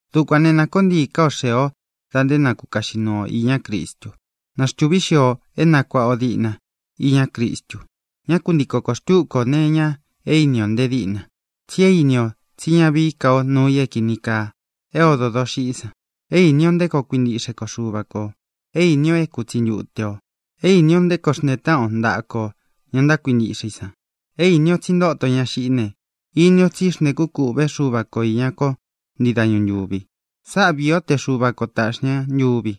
Dukuān né, nā koó ntii ká o xee o da nté na kukaꞌxi nuu ō iñá Cristu. Na xtūví xio o é nakuāꞌa o diꞌna iña Cristu. Ñá ku ntiko koō xtúku ō nee iña é ini ō nte díꞌna, tsi é īni o tsí ña vií ka o nuu i é kīni kaa é odō doxiꞌí san; é īni o nté koo kuintiꞌxé ko Xuva kō. É īni o é kutsi ntute o; é īni o nté koo xntee táꞌan o ntaꞌa kō ña ntákuintiꞌxe i san. É īni o tsí ntōto ña xiꞌí ne, ini ó tsi xntēkú kūꞌvé Xuva ko īña kó ntii dañu ntūvi. Sáꞌa viī ó te Xuva ko tāꞌxi ña ntuvi.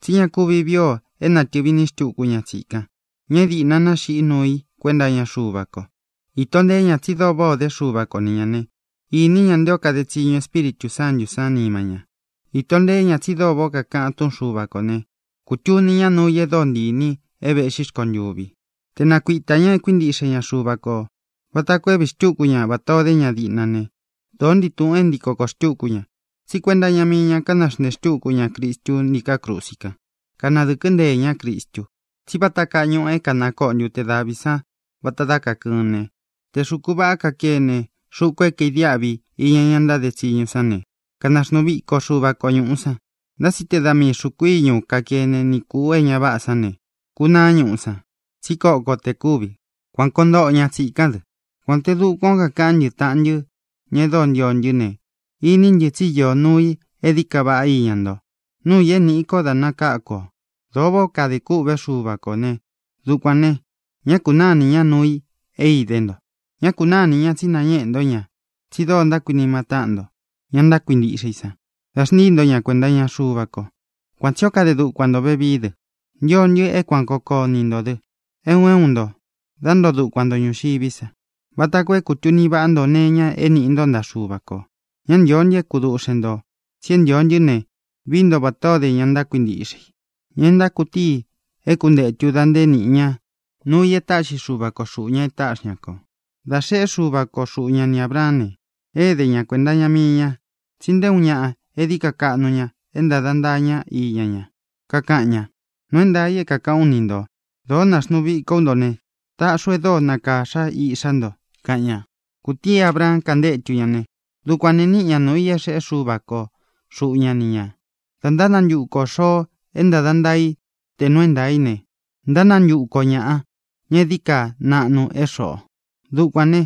Tsí ña kuvi vií ō é nātɨvi iní xtuku ña tsīkan, ña é dīꞌna naxiꞌí nuu i kuenta iña Xuva ko. Īto nteé ña tsi dóo váꞌā o dé Xuva ko ni ñā né, ini ña nté o kade tsiñu Espíritū Sántū sán nima ña. Īto nteé ña tsi dóo váꞌā ó kakaꞌan túꞌun Xuva kō né, kūtuni ñá nuu i e dóo ntii īni i é vēꞌxí rkontuvi. Te nākuita ña é kuintiꞌxe ña Xuva kō vata koo é vīí xtuku ña vatā o dé ña diꞌna ne, dōó ntii tūꞌun é ntiko koō xtuku ña, tsí kuenta iña mii ña kánaxnteē xtúku ña Cristu ntíkā krusi kan. Kanadɨ̄kɨ́ nteē ñá Cristu. Tsí vata kaa ñuꞌu é kānakoꞌo ntute davi san vata dá kakɨɨn ne, te xūku vaꞌá kakene, xuku é kaidiáꞌvi iña ña ntáde tsiñu san ne, kanaxnuu víko Xuva ko ñūꞌu san. Ntá tsi te da mii xūku íñu kakene ni kūꞌu é ña váꞌa sán ne, kunaá ñuꞌu san, tsí koko te kúvi. Kuan koo ntoꞌo ña tsīkán dɨ. Kuān té dukuán o kakaꞌán ntɨ, taꞌan ntɨ, ña e dóo ntio ntɨ́ ne, iní ntɨ tsi íō nuu i e dií ka vaꞌá iña nto, nuu i é nīꞌi ko dá nakáku ō. Dōo váꞌā ó kadē kûꞌvé Xuva kō né, dukuān ne, ñá kūnáa inī ñá nuu i é idé nto. Ñá kūnáa inī ña tsi nañéꞌe ntó ña tsi dóo ntákuinima ntó taꞌan nto, ña ntákuintiꞌxe i san, dā xntíi nto ña kuēnta iña Xuva ko. Kuan tsī ó kade dukuan ntō vevií dɨ. Ntio ntɨ é kuan kōo koó ntii ntō dɨ, é un é un nto, dá ntoo dukuan nto ñūxiví sa, vata koo é kūtuni vaꞌá nto nee iña é nīꞌi nto ntaꞌa Xúva kō. Ñá ntīo ntɨ é kuduꞌxen ntō, tsi é ntīo ntɨ́ ne, vií nto vatā ó de ña ntákuintiꞌxe i, ña é ntákutií i é kuntētu da nté nīꞌi ña núu i e táꞌxi Xuva ko xūꞌu ña é taꞌxi ña kō. Dā xeꞌé Xuva ko xuꞌu ña ni Ābraán ne, ēde ña kuenta iña mii ña, tsi nté uun ñaꞌa é dií ka kaꞌnu ña é ntāda ntaa ñá iña ña. Kakaꞌan ña: “Nuu é ntaā i é kākaꞌán u ni ntō. Dōo náxnuu viko ú nto ne, taꞌxi u e dóo nakāxa íꞌxá nto”, kaꞌan ña. Kūtíi Abraan kantétu ña ne, dukuān ne, níꞌi ñā nuu i é xeꞌé Xuva ko xuꞌu ña ni ñā. Dā ntánantuku ō xoo é ntāda ntaa i te nuu é ntaā í ne, ntánantuku o ñāꞌa, ña é dií ka naꞌnu é xoꞌō. Dukuān né,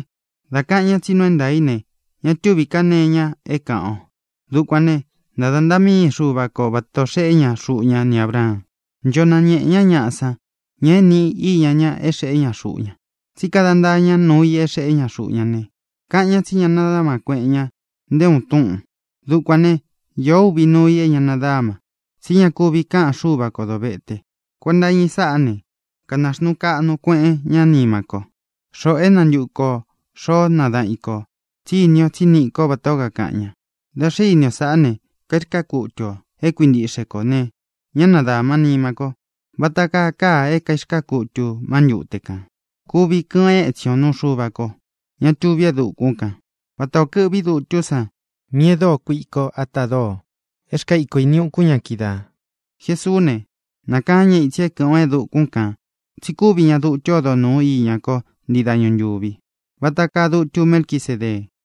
dā kaꞌan ñá tsi nuu é ntaā í ne, ña túvi ká nee iña é kāꞌan o. Dukuān né, ntāda ntaa míi Xuva ko vata ō xeꞌé ña xuꞌu ña ni Ābraan. Ncho nañēꞌe ñá ñaꞌa san, ña é nīꞌi i íña ña é xeꞌé ña xuꞌu ña, tsi kada ntáa ñá nuu i é xeꞌé ña xuꞌu ña ne, kaꞌan ña tsi ñá nadāma kueꞌen ña nté uun túꞌūn. Dukuān né, īó uvi nuu i é ña nadáma, tsí ña kuvi káꞌan Xúva kō dovete. Kuenta iña i sáꞌa ne, kanaxnūu kaꞌnu kueꞌen ñá nima ko, xoꞌō é nantuku ō xoó nadaꞌan i kō, tsí īni o tsí niꞌi ko vatā ó kakaꞌan ña. Dā xé ini o sáꞌā ne, kairkaá kutu ō é kuintiꞌxe kō ne, ñá nadāma nima kó, vata kaa kaa é kairkaa kutū má ntute kān. Kuvi kɨꞌɨn étsin ō nuu Xuva ko, ña tuví e dukún kān, vata ō kɨꞌví dutú san míꞌi e dóo kuiko ata doo é rkaa iko ini ukun ña kídaā. Jesuú ne, nākaán ña itsi é kɨ̄ꞌɨn o e dukún kān tsi kúvi ña dutu ódo nūu iña kó ntii dañu ntūvi, vata kaa dutu Melquisedee.